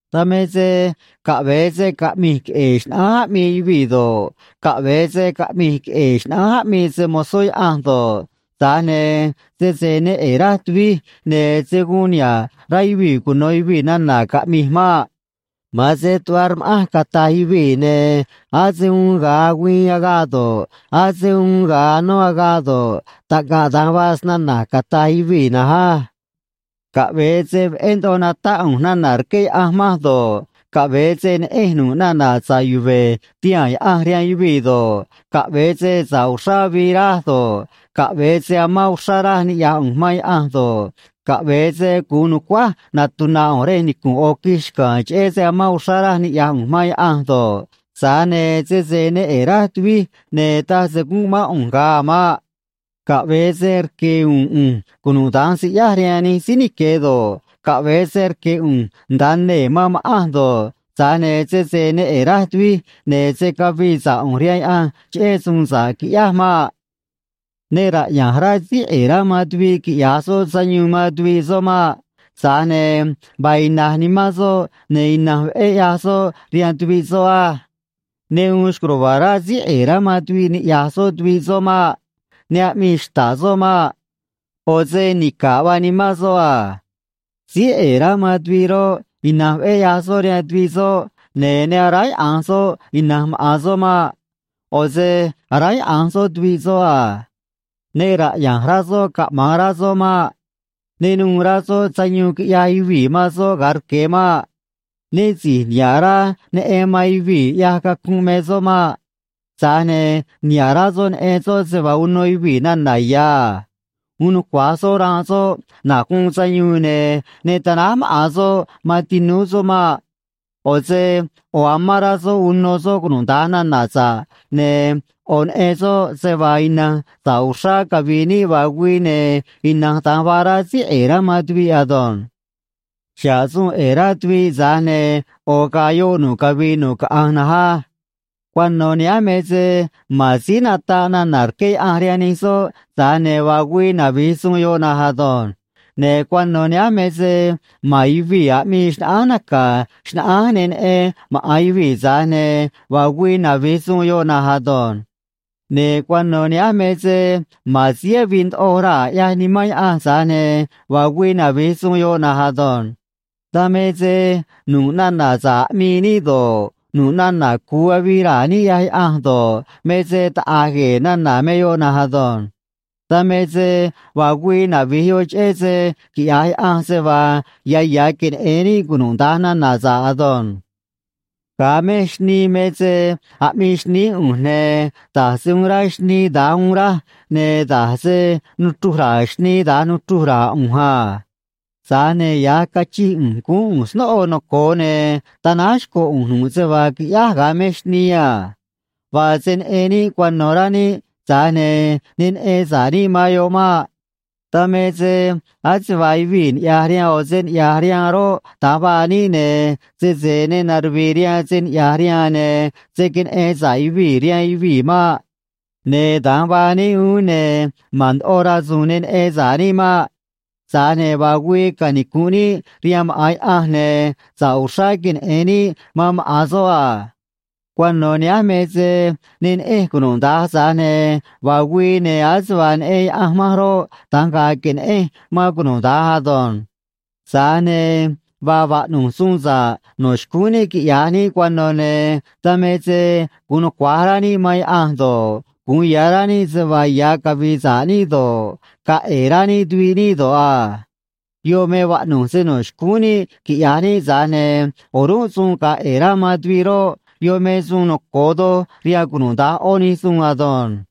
Dan me se caꞌve̱e se caꞌmi̱j queꞌe̱e̱ xnaꞌánj aꞌmii yuvii̱ do̱ꞌ, caꞌve̱e se caꞌmi̱j queꞌe̱e̱ xnaꞌánj aꞌmii se‑mo̱zó Yaꞌanj do̱ꞌ, tza̱j ne̱ sese ne ꞌe̱e̱ raj tuvij, ne̱ se̱ guun niha̱ꞌ rá yuvii̱ cuno̱ yuvii̱ nana̱ caꞌmi̱j maꞌ. Ma̱an se tuꞌva rma̱ꞌanj, cata̱j yuvii̱, ne̱ ase uun ga̱a agüiin agaꞌ do̱ꞌ, ase uun ga̱a anó agaꞌ do̱ꞌ, taꞌngaꞌ da̱nj vaa snana̱j, cata̱j yuvii̱ na̱nj á. Caꞌve̱e se veꞌé ndoꞌo natáꞌ ꞌu̱nj nana̱ rqué Yaꞌanj manj do̱ꞌ, caꞌve̱e se neꞌenj nu̱ꞌ nana̱ sa̱ꞌ yuve̱ tihaa̱n Yaꞌanj rihaan yuvii̱ do̱ꞌ, caꞌve̱e se sa̱ꞌ uxrá avii raj do̱ꞌ, caꞌve̱e se amán uxrá raj niꞌya̱j ꞌu̱nj man Yaꞌanj do̱ꞌ, caꞌve̱e se gu̱un nu̱cuáj natuna̱ ꞌu̱nj rej nicu̱nꞌ ꞌo̱ quij xca̱a̱n cheꞌé se amán uxrá raj niꞌya̱j ꞌu̱nj man Yaꞌanj do̱ꞌ, tza̱j ne̱ sese ne ꞌe̱e̱ raj tuvij, ne̱ taj se gúnꞌ mán ꞌu̱nj ga̱a a̱ maꞌ. Caꞌve̱e se rque̱ u̱u̱n ꞌu̱nj cunuda̱nj siꞌyáj rihaan nij síí nique̱ do̱ꞌ, caꞌve̱e se rque̱ ꞌu̱nj nda̱a nee̱ man ma̱ꞌanj do̱ꞌ, tza̱j ne̱ sese ne ꞌe̱e̱ raj tuvij, ne̱ se̱ cavii sa̱ꞌ ꞌu̱nj rihaan Yaꞌanj cheꞌé suun sa̱ꞌ quiꞌyáj maꞌ. Ne raꞌya̱nj rá síí ꞌe̱e̱ rá man tuviꞌ quiꞌya̱j soꞌ sayuun man tuviꞌ soꞌ maꞌ. Tza̱j ne̱ vaa ina̱j nimán soꞌ, ne̱ ina̱nj veꞌé ꞌyaj soꞌ rihaan tuviꞌ soꞌ á. Ne uun xco̱j ruva̱a̱ rá síí ꞌe̱e̱ rá man tuviꞌ niꞌya̱j soꞌ tuviꞌ soꞌ maꞌ. Ne aꞌmii xta̱ꞌ soꞌ maꞌ. ꞌO̱ se nica̱ꞌ vaa nimán soꞌ a. Síí ꞌe̱e̱ rá man tuviꞌ roꞌ, ina̱nj veꞌé ꞌyaj soꞌ rihaan tuviꞌ soꞌ, ne̱ ne aráyaꞌa̱nj soꞌ ina̱nj maꞌa̱n soꞌ maꞌ. ꞌO̱ se aráyaꞌa̱nj soꞌ tuviꞌ soꞌ a. Ne raꞌya̱nj rá soꞌ caꞌma̱an rá soꞌ maꞌ. Ne nuû rá soꞌ sayuun quiꞌyaj yuvii̱ man soꞌ ga̱a rque̱ maꞌ. Né si̱j niha̱ꞌ rá neꞌen man yuvii̱ ꞌyaj cacunꞌ me soꞌ maꞌ. Tza̱j ne̱ niha̱ꞌ rá soꞌ neꞌen soꞌ se vaa uno yuvii̱ nana̱ ya̱ a. Uun nucua̱j soꞌ ranꞌ soꞌ na̱j guun sayuun, ne̱ ne tanáj maꞌa̱n soꞌ man tinúú soꞌ maꞌ. ꞌO̱ se ꞌo̱ amán rá soꞌ uno soꞌ cunuda̱nj nana̱ sa̱ꞌ, ne̱ ꞌo̱ neꞌen soꞌ se vaa ina̱nj sa̱ꞌ uxrá cavi̱i̱ níꞌ vaa güii, ne̱ ina̱nj da̱nj vaa rá síí ꞌe̱e̱ rá man tuviꞌ ado̱nj. Xa̱ꞌ suun ꞌe̱e̱ rá tuviꞌ, tza̱j ne̱ ꞌo̱ ga̱a̱ yoꞌ nu̱ꞌ cavii nu̱ꞌ caꞌanj na̱nj á. Cuano̱ nihánj me se ma̱n síí nataꞌ nana̱ rqué Yaꞌanj rihaan nij soꞌ, tza̱j ne̱ vaa güii navi̱j suun yoꞌ na̱nj ado̱nj. Ne̱ cuano̱ nihánj me se ma̱n yuvii̱ aꞌmii xnaꞌánj naca̱ xnaꞌánj ne neꞌen maꞌa̱n yuvii̱, tza̱j ne̱ vaa güii navi̱j suun yoꞌ na̱nj ado̱nj. Ne̱ cuano̱ nihánj me se ma̱n síí avii ndoꞌo raa̱, ꞌyaj Nimán Yaꞌanj, tza̱j ne̱ vaa güii navi̱j suun yoꞌ na̱nj ado̱nj. Dan me se nu̱ꞌ nana̱ sa̱ꞌ aꞌmii níꞌ do̱ꞌ, nu̱ꞌ nana̱ cu̱u avii raa̱ níꞌ ꞌyaj Yaꞌanj do̱ꞌ, me se taꞌa̱j gue̱e̱ nana̱ me yoꞌ na̱nj ado̱nj. Dan me se vaa güii navi̱j yoꞌ cheꞌé se quiꞌya̱j Yaꞌanj se vaa ya̱ ya̱ queneꞌe̱n níꞌ cunuda̱nj nana̱ sa̱ꞌ ado̱nj. Ga̱a mej xnii me se aꞌmii xnií ꞌu̱nj, ne̱ da̱j se uun rá xnii, da̱nj uun raj, ne̱ da̱j se nuchruj ra̱a̱ xnii, da̱nj nuchruj ra̱a̱ ꞌu̱nj a. Tza̱j ne̱ ya̱j cachij ꞌu̱nj, guún ꞌu̱nj snóꞌo noco̱o, ne̱ tanáj xco̱ ꞌu̱nj nu̱ꞌ se vaa quiꞌyáj ga̱a mej xnii a. Vaa se neꞌen níꞌ cuano̱, rá níꞌ, tza̱j ne̱ ne neꞌen sa̱ꞌ níꞌ man yoꞌ maꞌ. Dan me se ase vaa yuvii̱ niꞌya̱j rihaan ꞌo̱ se niꞌya̱j rihaan roꞌ, da̱nj vaa níꞌ, ne̱ sese ne naruvi̱i̱ rihaan se niꞌya̱j rihaan, ne̱ se̱ queneꞌen sa̱ꞌ yuvii̱ rihaan yuvii̱ maꞌ. Ne̱ da̱nj vaa níꞌ uún, ne̱ ma̱n ndoꞌo rasu̱u̱n ne neꞌen sa̱ꞌ níꞌ maꞌ. Tza̱j ne̱ vaa güii canicu̱nꞌ níꞌ rihaan maꞌa̱n Yaꞌanj, ne̱ sa̱ꞌ uxrá queneꞌe̱n níꞌ man maꞌa̱n soꞌ a. Cuano̱ nihánj me se ne neꞌenj cunuda̱nj, tza̱j ne̱ vaa güii, ne̱ ase vaa neꞌen Yaꞌanj manj roꞌ, da̱nj ga̱a̱ que̱neꞌenj man cunuda̱nj ado̱nj. Tza̱j ne̱ vaa vaꞌnu̱j suun sa̱ꞌ no̱ xcúún níꞌ quiꞌya̱j níꞌ cuano̱, ne̱ dan me se gu̱un nucua̱j rá níꞌ man Yaꞌanj do̱ꞌ, gu̱un ya̱ rá níꞌ se vaa ya̱ cavi̱i̱ sa̱ꞌ níꞌ do̱ꞌ, ga̱a̱ ꞌe̱e̱ rá níꞌ tuviꞌ níꞌ do̱ꞌ a. Yoꞌ me vaꞌnu̱j se no̱ xcúún níꞌ quiꞌya̱j níꞌ, tza̱j ne̱ o̱rúnꞌ suun ga̱a̱ ꞌe̱e̱ rá man tuviꞌ roꞌ, yoꞌ me suun noco̱o doj rihaan cunuda̱nj ꞌó nij suun ado̱nj.